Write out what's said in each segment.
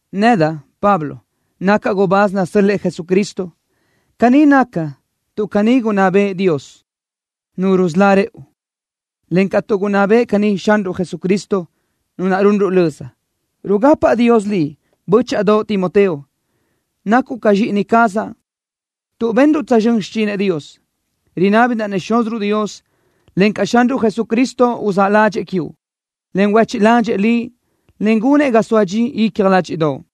Nedaʼ, Pablo, nacaʼ gubáz nasö́l-lëʼë Jesucristo. Caní nacaʼ tuʼ caní gunná bëʼë Dios, Nu rusölá rëʼu, encaʼ tuʼ gunná bëʼë caní Xanruʼ Jesucristo, Nu naʼ runruʼ löza. Rugapaʼ Dios liʼ, bö́chaʼadoʼ Timoteo. Nacuʼ ca zxíʼini cazaʼ tuʼ benruʼ tsözxö́n xichinëʼ Dios. Rinábidaʼ-nëʼ Xúziruʼ Dios, encaʼ Xanruʼ Jesucristo uzáʼ ládxëʼë quiuʼ, en huéchiʼ ládxëʼë liʼ, en gunëʼ ga soa dxi icja ládxiʼdoʼo.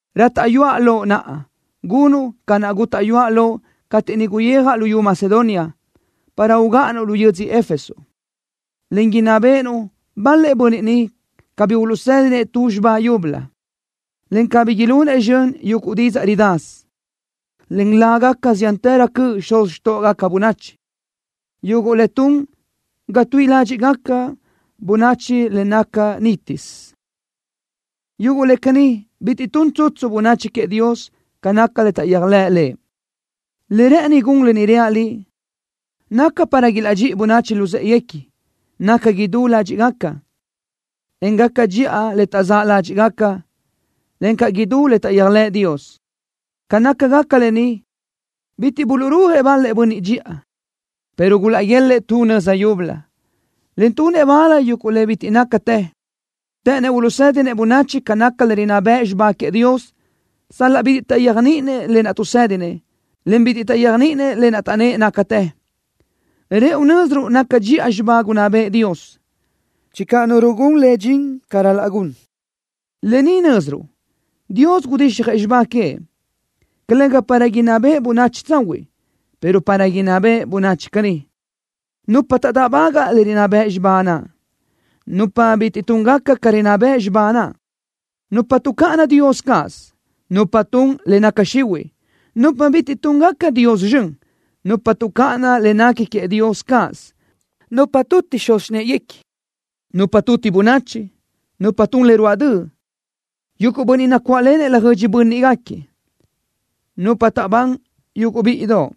Rátaʼyuaʼ loʼ naʼa gunuʼ ca naʼ gútaʼyuaʼ loʼ cateʼ niʼ guyijaʼ luyú Macedonia, para ugáʼanuʼ lu yödzö Éfeso, en inná béʼenuʼ bal-lëʼ bönniʼ niʼ cabí uluʼsédinëʼ tu xibá yúbölö, en cabí ilunëʼ zxön yuguʼ didzaʼ ridasö, en lágaca ziántërö cöʼ xuz xtóʼogaca bönachi, yuguʼ le tun ga tuíʼi ládxiʼgaca bönachi le nácagaca nítisö. Yuguʼ le caní bitiʼ tun tsutsu bönachi queëʼ Dios ca naca le taʼyéajlëʼ Lëʼ. Le rë́ʼëni gun lë ni reaʼ liʼ, naca para ilaʼdxíʼi bönachi luzë́ʼeguequi, naca idú ládxiʼgaca, en gaca dxiʼa le taʼzáʼ ládxiʼgaca, en gaca idú le taʼyéajlëʼ Dios. Ca nácagaca lë ni, bitiʼ buluʼrúajëʼ bal-lëʼ bönniʼ dxiʼa, pero gulaʼguélëʼë tu nöza yúbölö, en tunëʼ bal yuguʼ le bitiʼ nácatë. Të́ʼënnëʼ uluʼsédinëʼ bönachi ca naca le rinná bëʼ xibá queëʼ Dios, sal-laʼ bitiʼ taʼyéajniʼinëʼ lë naʼ tuʼsédinëʼ, en bitiʼ taʼyéajniʼinëʼ le taʼnnë́ʼ nácatë. Rëʼu nö́ziruʼ naca dxiʼa xibá gunná bëʼë Dios, channö nu rugún le dxin ca ral-laʼ gun. Lë ni nö́ziruʼ: Dios gudixjëʼ xibá queëʼ, calëga para inná beʼe bönachi tsahuiʼ, pero para inná beʼe bönachi caní: Nupa taʼdáʼbagaʼ le rinná bëʼ xibá naʼ. Nupa bitiʼ túngaca ca rinná bëʼ xibá naʼ. Nupa tuʼcáʼana Dios cáʼasö. Nupa tun le naca xihuiʼ. Nupa bitiʼ túngaca Dios zxön. Nupa tuʼcáʼana le nequi queëʼ Dios cáʼasö. Nupa tuti xuz xináʼaguequi. Nupa tuti bönachi. Nupa tun le ruáʼ döʼ. Yuguʼ bönniʼ nacuáʼlenëʼ laʼ löjödxi bö́nniʼgaquiëʼ. Nupa taʼbán yuguʼ bíʼidoʼ.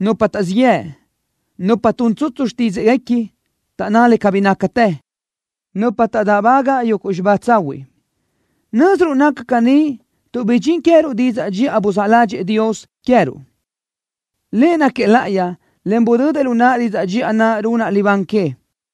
Nupa taʼzíʼ yëʼ. Nupa tun tsutsu xtídzaʼguequi, taʼnná le cabí nácatë. Nupa taʼdáʼbaga yuguʼ xibá tsahuiʼ. Nö́ziruʼ naca caní tuʼ bidxín queë́ruʼ didzaʼ dxiʼa buzáʼ ládxëʼë Dios queë́ruʼ. Lëʼ náquiëʼ láʼayi, en budödëʼ lu naʼa didzaʼ dxiʼa naʼ runaʼ libán que.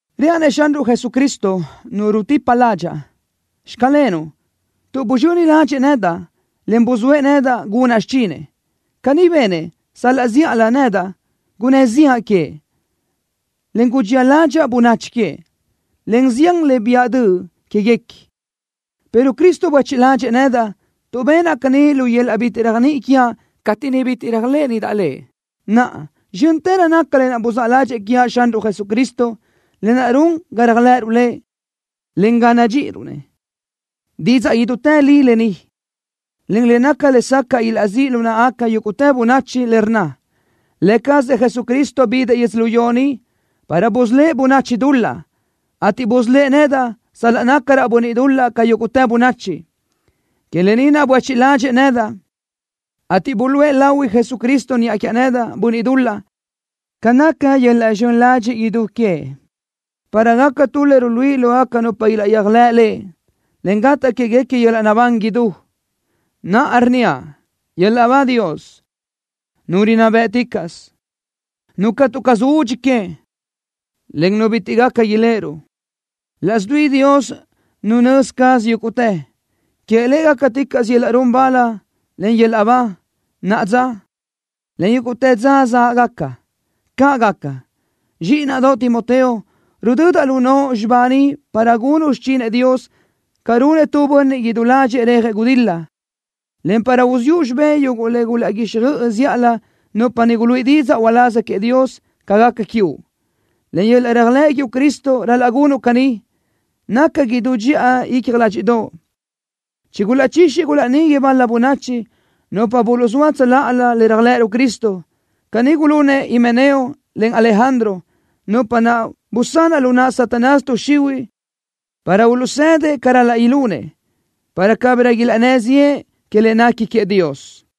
Reaʼ-nëʼ Xanruʼ Jesucristo, Nu rutipa ládxaʼa, “Xclenuʼ” tuʼ buzxöni ládxëʼë nedaʼ, en buzóëʼ nedaʼ gunaʼ xichinëʼ. Caní benëʼ sal-laʼ zíʼalö nedaʼ gunnë́ ziʼa queëʼ, en gudxía ládxaʼa bönachi queëʼ, en zián le biʼa döʼ quéguequi, pero Cristo buéchiʼ ládxëʼë nedaʼ, tuʼ benaʼ caní lu yöl-laʼ bitiʼ réajniʼi quiaʼ cateʼ niʼ bitiʼ réajlëʼënidaʼ Lëʼ. Naʼa, zxö́ntërö naca le buzáʼ ládxëʼë quiaʼ Xanruʼ Jesucristo, lë naʼ run ga réajlëʼëruʼ Lëʼ, encaʼ ga nadxíʼiruʼ-nëʼ. Didzaʼ idútë li lë ni, en le naca lesacaʼ ilaʼzíʼ lu náʼagaca yúguʼtë bönachi, le rnna: Lë cazëʼ Jesucristo bidëʼ yödzölió ni para busölë́ʼ bönachi dul-laʼ, ateʼ busölë́ʼ nedaʼ sal-laʼ nácaraʼ bönniʼ dul-laʼ ca yúguʼtë bönachi. Que lë ni naʼ buéchiʼ ládxëʼë nedaʼ, ateʼ buluʼe lahui Jesucristo niʼa quiaʼ nedaʼ, bönniʼ dul-laʼ, ca naca yöl-laʼ zxön ladxiʼ idú queëʼ, para gacaʼ tu le ruluíʼi lógaca nupa ilaʼyéajlëʼ Lëʼ, en gataʼ quéguequi yöl-laʼ naʼbán idú. Naʼa rnníaʼ: ¡Yöl-laʼ ba Dios, Nu rinná bë́ʼticaʼsö, Nu catu caz údxi que, en Nu bitiʼ gaca iléʼeruʼ, laʼs dui Dios Nu nözi caz yúguʼtë! ¡Queëʼ Lëʼ gácaticaʼsö yöl-laʼ run bal, en yöl-laʼ ba, naʼa dza, en yúguʼtë dza záʼgaca! ¡Caʼ gaca! Zxíʼinaʼdoʼ Timoteo, rudödaʼ lu noʼo xibá ni para gunuʼ xichinëʼ Dios ca runëʼ tu bönniʼ idú ládxëʼë rejëʼ gudil-la, en para uziʼu xibé yuguʼ le gulaʼguíxjöʼ zíʼalö nupa niʼ guluíʼi didzaʼ uláz queëʼ Dios ca gaca quiuʼ. Len yöl-laʼ réajlëʼ quiuʼ Cristo ral-laʼ gunuʼ caní, naca idú dxiʼa icja ládxiʼdoʼo. Chigulaʼchixi gulaʼnigui bal-la bönachi, nupa buluʼzóa tsöláʼalö le réajlëʼëruʼ Cristo. Caní gulunëʼ Himeneo, en Alejandro, nupa naʼ busanaʼ lu naʼ Satanás tuʼ xihuiʼ para ilaʼzëdëʼ ca ral-laʼ ilunëʼ, para cabirö ilaʼnnë́ ziʼë que le nequi queëʼ Dios.